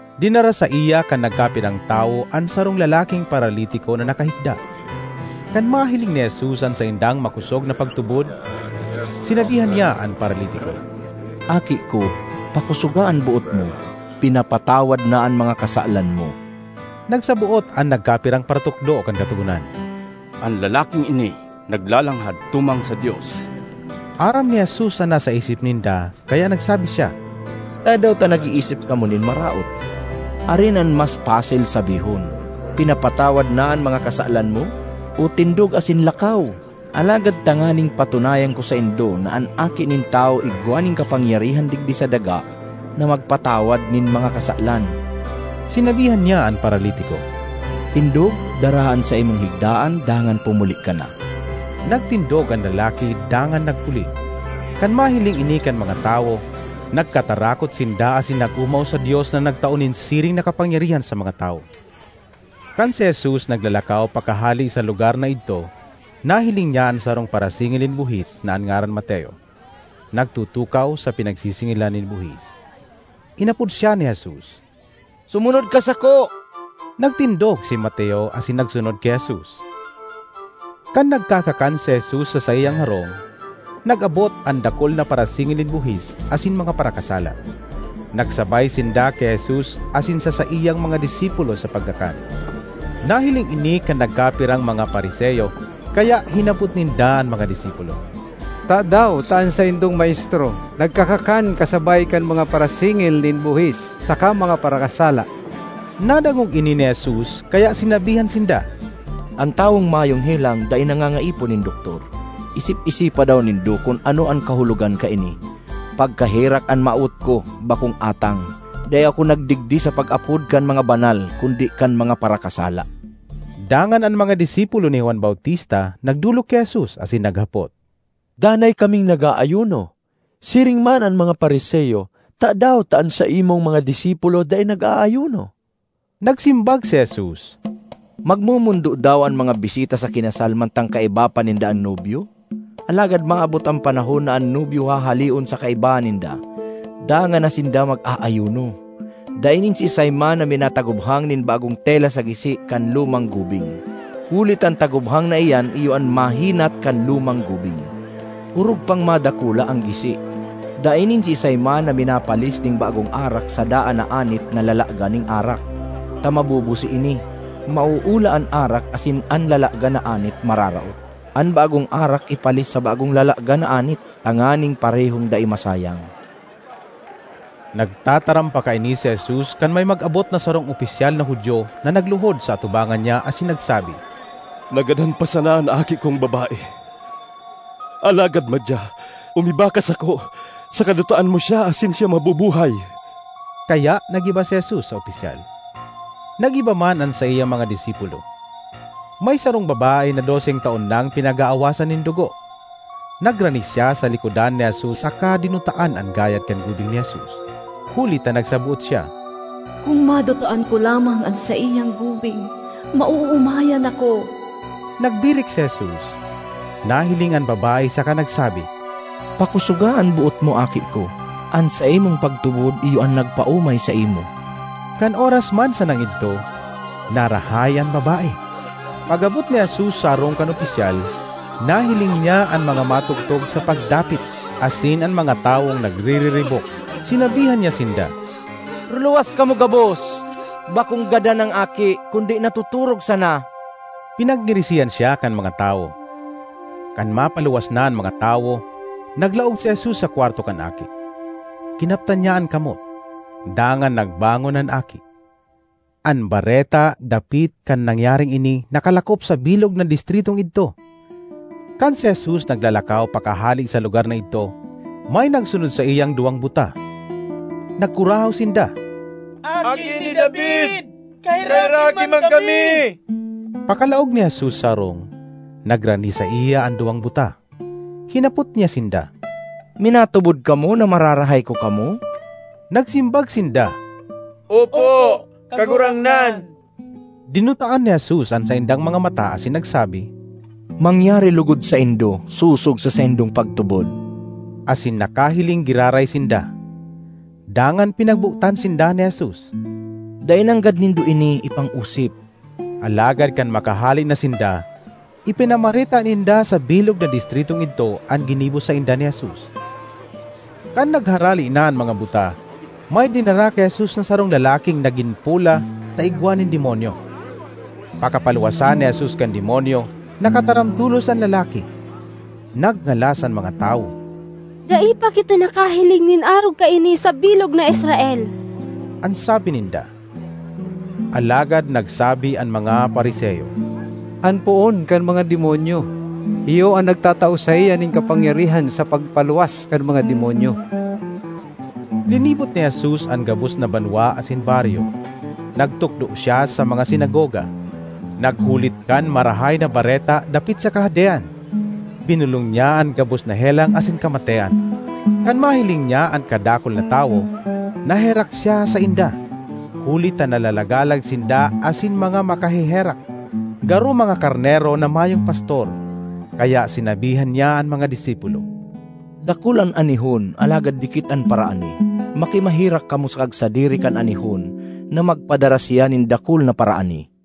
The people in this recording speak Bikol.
Dinara saiya kan nagkapirang tawo an sarong lalaking paralitiko na nakahigda. Kan mahiling ni Jesus an saindang makosog na pagtubod, sinabihan niya an paralitiko, “Aki ko, pakosoga an boot mo! Pinapatawad na an mga kasalan mo.” Nagsaboot an nagkapirang paratukdo kan Katogonan, “An lalaking ini naglalanghad tumang sa Dios!” Aram ni Jesus an nasa isip ninda kaya nagsabi siya, “Tadaw ta nag-iisip kamo nin maraot? Arin an mas pasil sabihon, ‘Pinapatawad na an mga kasalan mo’, o ‘Tindog asin lakaw’? Alagad tanganing patunayan ko saindo na an Aki nin Tawo igwa nin kapangyarihan digdi sa daga na magpatawad nin mga kasalan,” sinabihan niya an paralitiko, “Tindog, daraha an saimong higdaan dangan pumuli ka na!” Nagtindog an lalaki dangan nagpuli. Kan mahiling ini kan mga tawo, nagkatarakot sinda asin nag-omaw sa Dios na nagtao nin siring na kapangyarihan sa mga tawo. Kan si Jesus naglalakaw pakahale sa lugar na idto, nahiling niya an sarong parasingil nin buhis na an ngaran Mateo, nagtutukaw sa pinagsisingilan nin buhis. Inapod siya ni Jesus, “Sumunod ka sako.” Nagtindog si Mateo asin nagsunod ki Jesus. Kan nagkakakan si Jesus sa saiyang harong, nag-abot an dakul na parasingil nin buhis asin mga parakasala. Nagsabay sinda ki Jesus asin sa saiyang mga disipulo sa pagkakan. Nahiling ini kan nagkapirang mga Fariseo kaya hinapot ninda an mga disipulo, “Tadaw ta an saindong maestro nagkakakan kasabay kan mga parasingil nin buhis saka mga parakasala?” Nadangog ini ni Jesus kaya sinabihan sinda, “An tawong mayong helang dai nangangaipo nin doktor. Isip-isipa daw nindo kun ano an kahulogan kaini, ‘Pagkaherak an mawot ko, bakong atang.’ Dai ako nagdigdi sa pag-apod kan mga banal kundi kan mga parakasala.” Dangan an mga disipulo ni Juan Bautista nagdolok ki Jesus asin naghapot, “Danay kaming nag-aayuno, siring man an mga Fariseo. Tadaw ta an saimong mga disipulo dai nag-aayuno?” Nagsimbag si Jesus, “Magmomondo daw an mga bisita sa kinasal mantang kaiba pa ninda an nobyo? Alagad maabot an panahon na an nobyo hahaleon sa kaibahan ninda, dangan na sinda mag-aayuno! ”Dai nin siisay man na minatagubhang nin bagong tela sa gisi kan lumang gubing; huli ta an tagubhang na iyan iyo an mahinat kan lumang gubing; orog pang madakula an gisi. Dai nin siisay man na minapalis nin bagong arak sa daan na anit na lalagan nin arak, ta mabubusi ini; mauula an arak asin an lalagan na anit mararaot. An bagong arak ipalis sa bagong lalagan na anit, tanganing parehong dai masayang.” Nagtataram pa kaini si Jesus kan may mag-abot na sarong opisyal na Judio na nagluhod sa atubangan niya asin nagsabi, “Nagadan pa sana an aki kong babae; alagad madya, umiba ka sako saka dutaan mo siya asin siya mabubuhay.” Kaya nag-iba si Jesus sa opisyal; nag-iba man an saiyang mga disipulo. May sarong babae na doseng taon nang pinag-aawasan nin dugo. Nagrani siya sa likodan ni Jesus saka dinutaan an gayad kan gubing ni Jesus. Huli ta nagsaboot siya, “Kun madutaan ko lamang an saiyang gubing, maoomayan ako.” Nagbirik si Jesus, nahiling an babae saka nagsabi, “Pakosoga an boot mo, aki ko! An saimong pagtubod iyo an nagpaomay saimo.” Kan oras man sanang idto narahay an babae. Pag-abot ni Jesus sa harong kan opisyal, nahiling niya an mga matugtog sa pagdapit asin an mga tawong nagririribok. Sinabihan niya sinda, “Ruluwas kamo gabos. Bakong gadan an aki kundi natotorog sana!” Pinagngirisihan siya kan mga tawo. Kan mapaluwas na an mga tawo, naglaog si Jesus sa kwarto kan aki. Kinaptan niya an kamot, dangan nagbangon an aki. An bareta dapit kan nangyaring ini nakalakop sa bilog na distritong idto. Kan si Jesus naglalakaw pakahale sa lugar na idto, may nagsunod saiyang duwang buta. Nagkurahaw sinda, “Aki ni David, kaheraki man kami!” Pakalaog ni Jesus sa harong, nagrani saiya an duwang buta. Hinapot niya sinda, “Minatubod kamo na mararahay ko kamo?” Nagsimbag sinda, “Opo, Kagurangnan!” Dinutaan ni Jesus an saindang mga mata asin nagsabi, “Mangyari logod saindo sosog sa saindong pagtubod!” Asin nakahiling giraray sinda. Dangan pinagbotan sinda ni Jesus, “Dai nanggad nindo ini ipang-osip!” Alagad kan makahale na sinda, ipinamareta ninda sa bilog na distritong idto an ginibo sainda ni Jesus. Kan nagharale na an mga buta, may dinara ki Jesus na sarong lalaking nagin pola ta igwa nin demonyo. Pakapaluwasa ni Jesus kan demonyo, nakataram tolos an lalaki. Nagngalas an mga tawo. “Dai pa kita nakahiling nin arog kaini sa bilog na Israel!” an sabi ninda. Alagad nagsabi an mga Fariseo, “An poon kan mga demonyo iyo an nagtatao saiya nin kapangyarihan sa pagpaluwas kan mga demonyo.” Linibot ni Jesus an gabos na banwa asin baryo. Nagtukdo siya sa mga sinagoga, naghulit kan Marahay na Bareta dapit sa Kahadean. Binolong niya an gabos na helang asin kamatean. Kan mahiling niya an kadakul na tawo, naherak siya sainda, huli ta nalalagalag sinda asin mga makaheherak, garo mga karnero na mayong pastor. Kaya sinabihan niya an mga disipulo, “Dakul an anihon, alagad dikit an paraani. Makimaherak kamo sa kagsadiri kan anihon na magpadara siya nin dakul na paraani.”